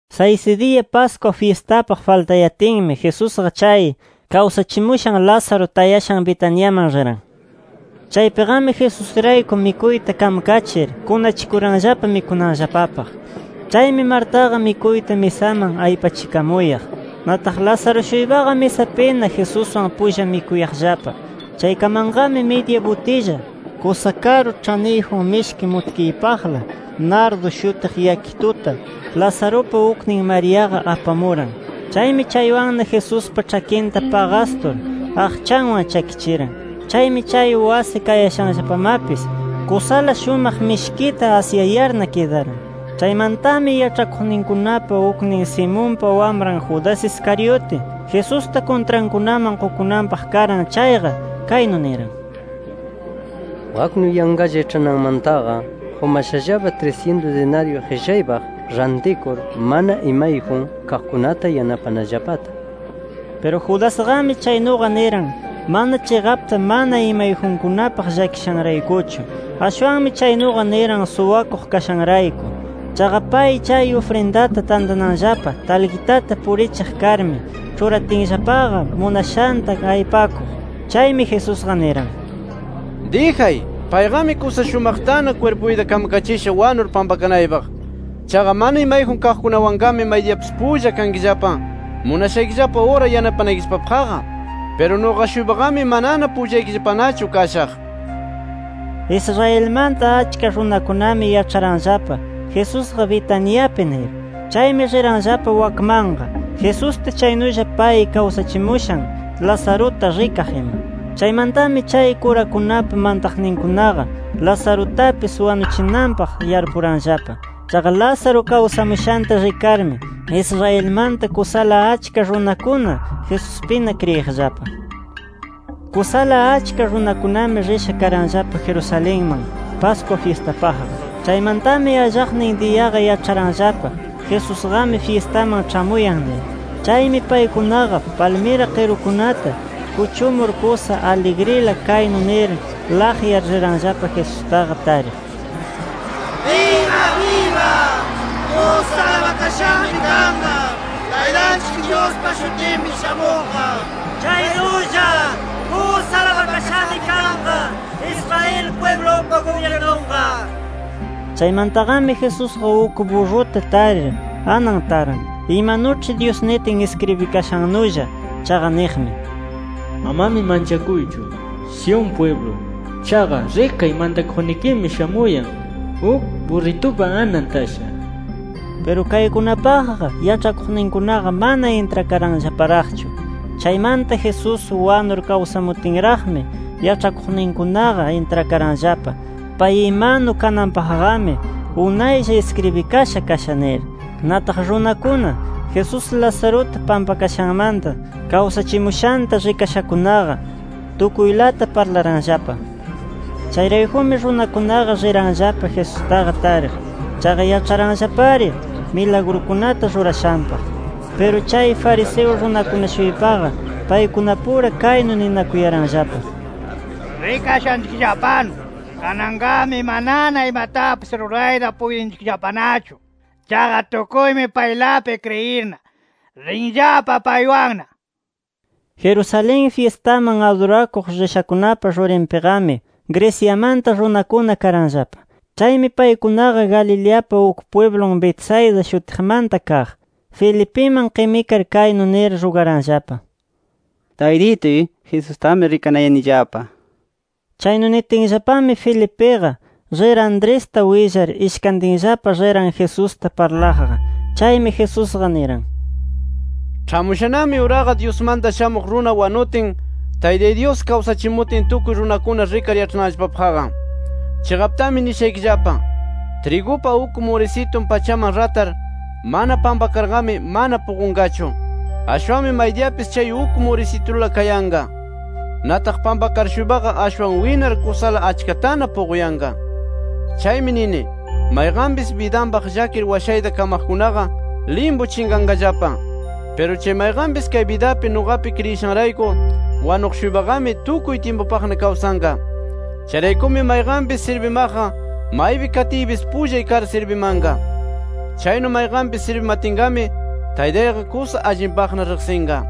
Saysi diya, Pascua fyistapaq faltayatinmi, Jesusqa chay kawsachimushan Lázaro tayashan Betaniaman riran. Chaypiqami Jesusrayku mikuyta kamkachir, kunachikuranllapa mikunanllapapaq. Chaymi, Martaqa mikuyta misaman aypachikamuyaq. Nataq Lázaro-shuypaqa misapina Jesuswan pulla mikuyaqllapa. Chaykamanqami, midya butilla kusa karu ĉhaniyjun mishki mutkiypaqla nardo shutiq yakituta, Lazarupa uknin Mariaqa apamuran. Chaymi chaywanna Jesuspa ĉhakinta paqastur, aqchanwan chakichiran. Chaymi, chay wasi kayashanllapamapis kusala shumaq mishkita asyayarna kidaran. Chaymantami, yaĉhakuqninkunapa uknin [Simonpa wamran] Judas Iscariote, Jesusta kuntrankunaman qukunanpaq karan chayqa, kaynu niran: —Waknu yanqalla iĉhananmantaqa qumashallapa trisyintus dinaryu qillaypaq rantikur, mana imayjun kaqkunata yanapanallapata nir. Piru Judasqami chaynuqa niran, mana chiqapta mana imayjunkunapaq llakishanraykuchu. Ashwanmi chaynuqa niran suwakuq kashanrayku. Chaqa pay chay ufrindata tantananllapa talqitata purichiq karmi, ĉhuratinllapaqa munashanta aypakuq. Chaymi Jesusqa niran: —Dijay, payqami kusa shumaqtana kwirpuyta kamkachisha wanur pampakanaypaq. Chaqa mana imayjun kaqkunawanqami maydiyapis pulla kankillapa, munashaykillapa ura yanapanaykillapapaqqa. Piru nuqa-shuypaqami manana pullaykillapanachu kashaq nir. Israelmanta achka runakunami yaĉharanllapa, Jesusqa Betaniapi nir. Chaymi riranllapa wakmanqa, Jesusta chaynulla pay kawsachimushan Lazaruta rikaq ima. Chaymantami chay kurakunapa mantaqninkunaqa Lazarutapis wanuchinanpaq yarpuranllapa. Chaqa Lázaro kawsamushanta rikarmi Israelmanta kusala achka runakuna Jesuspina kriyiqllapa. Kusala achka runakunami risha karanllapa Jerusalenman, Pascua fyistapaqqa. Chaymantami allaqnin diyaqa yaĉharanllapa Jesusqami fyistaman ĉhamuyan nir. Chaymi paykunaqa palmira qirukunata kuchumur, kusa aligrila kaynu nir laqyar riranllapa Jesustaqa tariq: “¡Biba biba! ¡Kusa alabakashami kanqa Taytanchik Dyuspa shutinpi shamuqqa! Chaynulla ¡kusa alabakashami kanqa Israel pwiblupa gubyirnunqa!” nir. Chaymantaqami Jesusqa uk burruta tarir anan taran, imanuĉhi Dyus nitin iskribikashannulla. Chaqa niqmi: “Amami manchakuychu, Sión pwiblu. Chaqa rikay, mantakuqnikimi shamuyan uk burritupa anan tasha” nir. Piru kaykunapaqqa yaĉhakuqninkunaqa mana intrakaranllaparaqchu. Chaymanta Jesús wanur kawsamutinraqmi, yaĉhakuqninkunaqa intrakaranllapa, pay imanu kananpaqqami, unaylla iskribikasha kasha nir. Nataq runakuna, Jesús Lazaruta pampakashanmata kawsachimushanta rikashakunaqa, tukuylata parlaranllapa. Chayraykumi runakunaqa riranllapa Jesustaqa tariq. Chaqa yaĉharanllapari milagrukunata rurashanpaq. Piru chay fariseo runakuna-shuypaqa paykunapura kaynu ninakuyaranllapa: “Rikashaykillapanu kananqami manana imatapis rurayta puytinchikllapanachu. Chaqa tukuymi paylapi kriyirna, rinllapa paywanna” nir. Jerusalén fyistaman adurakuq rishakunapa rurinpiqami, Greciamanta runakuna karanllapa. Chaymi paykunaqa, Galileapa uk pwiblun Betsaida shutiqmanta kaq, Felipiman qimikar kaynu nir rugaranllapa: —Taytituy, Jesustami rikanayanillapa nir. Chaynu nitinllapami, Felipiqa rir Andresta willar, ishkantinllapa riran Jesusta parlaqqa. Chaymi Jesusqa niran: —Ĉhamushanami uraqa, Dyusmanta Shamuq Runa wanutin, Taytay Dyus kawsachimutin, tukuy runakuna rikar yaĉhananllapapaqqa. Chiqaptami nishaykillapa: Trigupa uk murisitun pachaman ratar mana pampakarqami mana puqunqachu. Ashwanmi maydiyapis chay uk murisitula kayanqa. Nataq pampakar-shuypaqa, ashwan winar kusala achkatana puquyanqa. Chaymi nini, mayqanpis bidanpaq llakir washayta kamaqkunaqa limpu chinqanqallapa. Piru chay mayqanpis kay bidapi nuqapi kriyishanrayku wanuq-shuypaqami, tukuy tyimpupaqna kawsanqa. Chayraykumi mayqanpis sirbimanaqqa, maypi katiypis pullay kar sirbimanqa. Chaynu mayqanpis sirbimatinqami, Taytayqa kusa allinpaqna riqsinqa.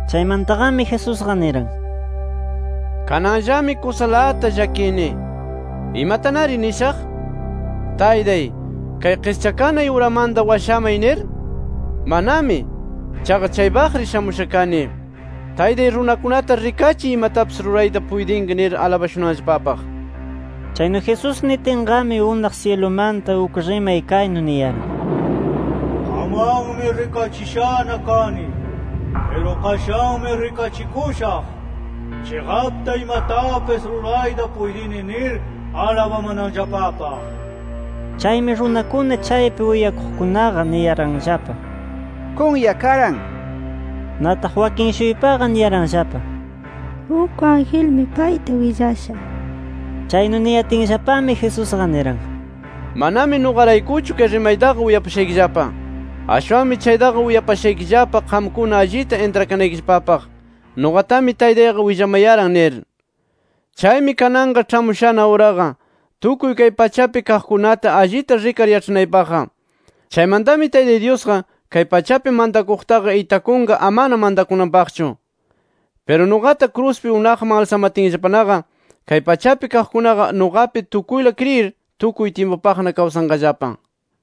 Chaymantaqami Jesusqa niran: “¡Kananllami kusalata llakini! ¿Imatanari nishaq? ¿Taytay kay qischakanay uramanta washamay, nir? ¡Manami! Chaqa chaypaq-ari shamusha kani. Taytay, runakunata rikachiy, imatapis rurayta puytinki nir alabashunanllapapaq”. Chaynu Jesús nitinqami, unaq syilumanta uk rimay kaynu niyaran: “Qamwanmi rikachishana kani. Piru qashanmi rikachikushaq, chiqapta imatapis rurayta puytini nir alabamananllapapaq”. Chaymi runakuna chaypi uyakuqkunaqa, niyaranllapa: “Kunya karan” nir. Nataq wakin-shuypaqa niyaranllapa: “Uk angelmi payta willasha” nir. Chaynu niyatinllapami, Jesusqa niran: —Manami nuqaraykuchu chay rimaytaqa uyapashaykillapa. Ashwanmi chaytaqa uyapashaykillapa qamkuna allita intrakanaykillapapaq, nuqatami Taytayqa willamayaran nir. Chaymi kananqa ĉhamushana uraqa, tukuy kay pachapi kaqkunata allita rikar yaĉhanaypaqqa. Chaymantami Taytay Dyusqa, kay pachapi mantakuqtaqa itakunqa amana mantakunanpaqchu. Piru, nuqata kruspi unaqman alsamatinllapanaqa, kay pachapi kaqkunaqa nuqapi tukuyla kriyir, tukuy tyimpupaqna kawsanqallapa.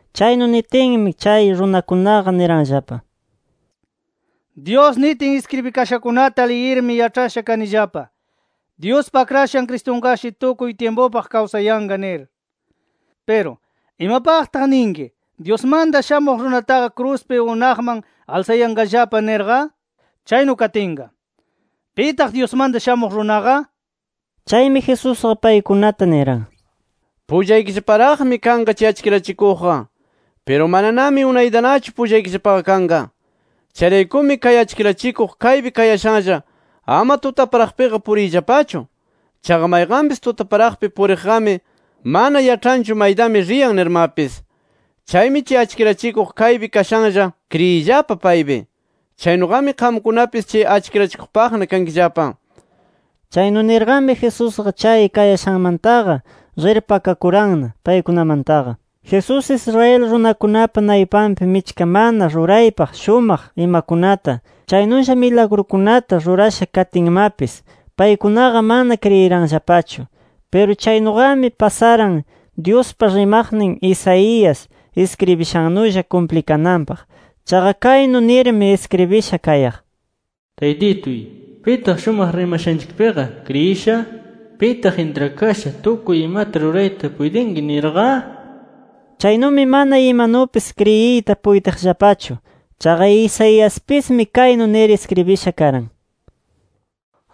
Chaynu nitinmi, chay runakunaqa niranllapa: —Dyus nitin iskribikashankunata liyirmi yaĉhasha kanillapa, Dyuspa Akrashan Cristunqashi tukuy tyimpupaq kawsayanqa nir. Piru ¿imapaqta ninki, Dyusmanta Shamuq Runataqa kruspi unaqman alsakayanqallapa nirqa? Chaynu katinqa, ¿pitaq Dyusmanta Shamuq Runaqa? nir. Chaymi Jesusqa paykunata niran: —Pullaykillaparaqmi kanqa chay achkirachikuqqa. Piru mananami unaytanachu pullaykillapaqa kanqa. Chayraykumi kay achkirachikuq kaypi kayashanlla, ama tutaparaqpiqa puriyllapachu. Chaqa mayqanpis tutaparaqpi puriqqami, mana yaĉhanchu maytami riyan nirmapis. Chaymi chay achkirachikuq kaypi kashanlla kriyiyllapa paypi. Chaynuqami qamkunapis chay achkirachikuqpaqna kankillapa. Chaynu nirqami, Jesusqa chay kayashanmantaqa rir pakakuranna paykunamantaqa. Jesús, Israel runakunapa naypanpi michka mana ruraypaq shumaq imakunata, chaynulla milagrukunata rurasha katinmapis, paykunaqa mana kriyiranllapachu. Piru chaynuqami pasaran, Dyuspa rimaqnin Isaías iskribishannulla kumplinanpaq. Chaqa kaynu nirmi iskribisha kayaq: “Taytituy, ¿pitaq shumaq rimashanchikpiqa kriyisha? ¿Pitaq intrakasha tukuy imata rurayta puytinki nirqa?” Chaynumi, mana imanupis kriyiyta puytiqllapachu. Chaqa Isaiaspismi kaynu nir iskribisha karan: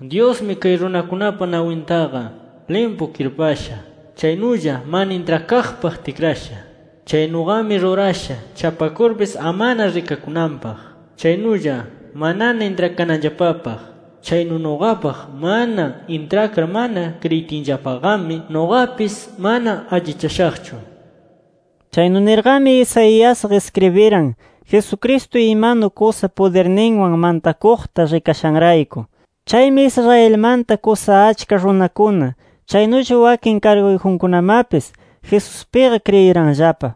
“Dyusmi kay runakunapa nawintaqa limpu kirpasha. Chaynulla mana intrakaqpaq tikrasha. Chaynuqami rurasha chapakurpis amana rikakunanpaq. Chaynulla manana intrakananllapapaq. Chaynu nuqapaq mana intrakar mana kriyitinllapaqami, nuqapis mana allichashaqchu” nir. Chaynu nirqami Isaiasqa iskribiran, Jesucristo imanu kusa pudirninwan mantakuqta rikashanrayku. Chaymi Israelmanta kusa achka runakuna, chaynulla wakin karguyjunkunamapis Jesuspiqa kriyiranllapa.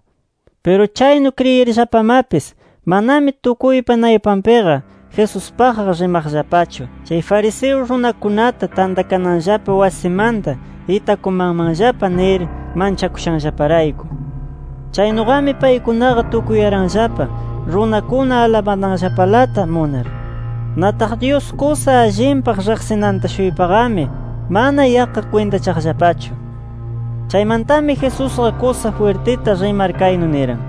Piru chaynu kriyirllapamapis, manami tukuypa naypanpiqa Jesuspaqqa rimaqllapachu, chay fariseo runakunata tantakananllapa wasimanta itakumanmanllapa nir manchakushanllaparayku. Chaynuqami paykunaqa tukuyaranllapa runakuna alabananllapalata munar. Nataq Dyus kusa allinpaq riqsinanta-shuypaqami mana yaqqa kwintachaqllapachu. Chaymantami Jesusqa kusa jwirtita rimar kaynu niran: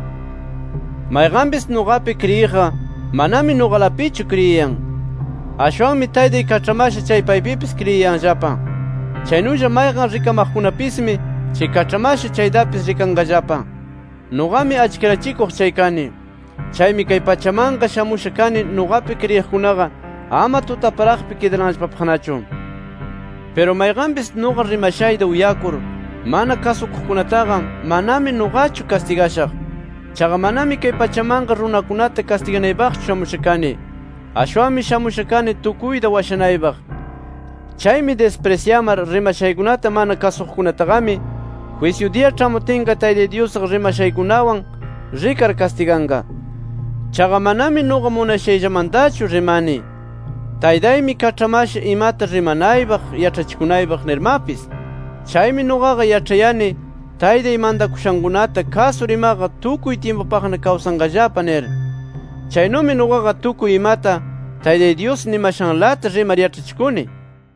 “Mayqanpis nuqapi kriyiqqa, manami nuqalapichu kriyiyan. Ashwanmi Taytay kaĉhamasha chay paypipis kriyiyanllapa. Chaynulla mayqan rikamaqkunapismi, chay kaĉhamasha chaytapis rikanqallapa. Nuqami achkirachikuq chay kani. Chaymi kay pachamanqa shamusha kani, nuqapi kriyiqkunaqa ama tutaparaqpi kidananllapapaqnachu. “Piru mayqanpis nuqa rimashayta uyakur, mana kasukuqkunataqa, manami nuqachu kastigashaq. Chaqa manami kay pachamanqa runakunata kastiganaypaqchu shamusha kani. Ashwanmi shamusha kani, tukuyta washanaypaq. Chaymi disprisyamar, rimashaykunata mana kasuqkunataqami, jwisyu diya ĉhamutinqa Taytay Dyusqa rimashaykunawan rikar kastiganqa. Chaqa manami nuqa munashayllamantachu rimani. Taytaymi kaĉhamasha, imata rimanaypaq, yaĉhachikunaypaq nirmapis. Chaymi nuqaqa yaĉhayani, Taytay mantakushankunata kasur imaqa tukuy tyimpupaqna kawsanqallapa nir. Chaynumi nuqaqa, tukuy imata Taytay Dyus nimashanlata rimar yaĉhachikuni”.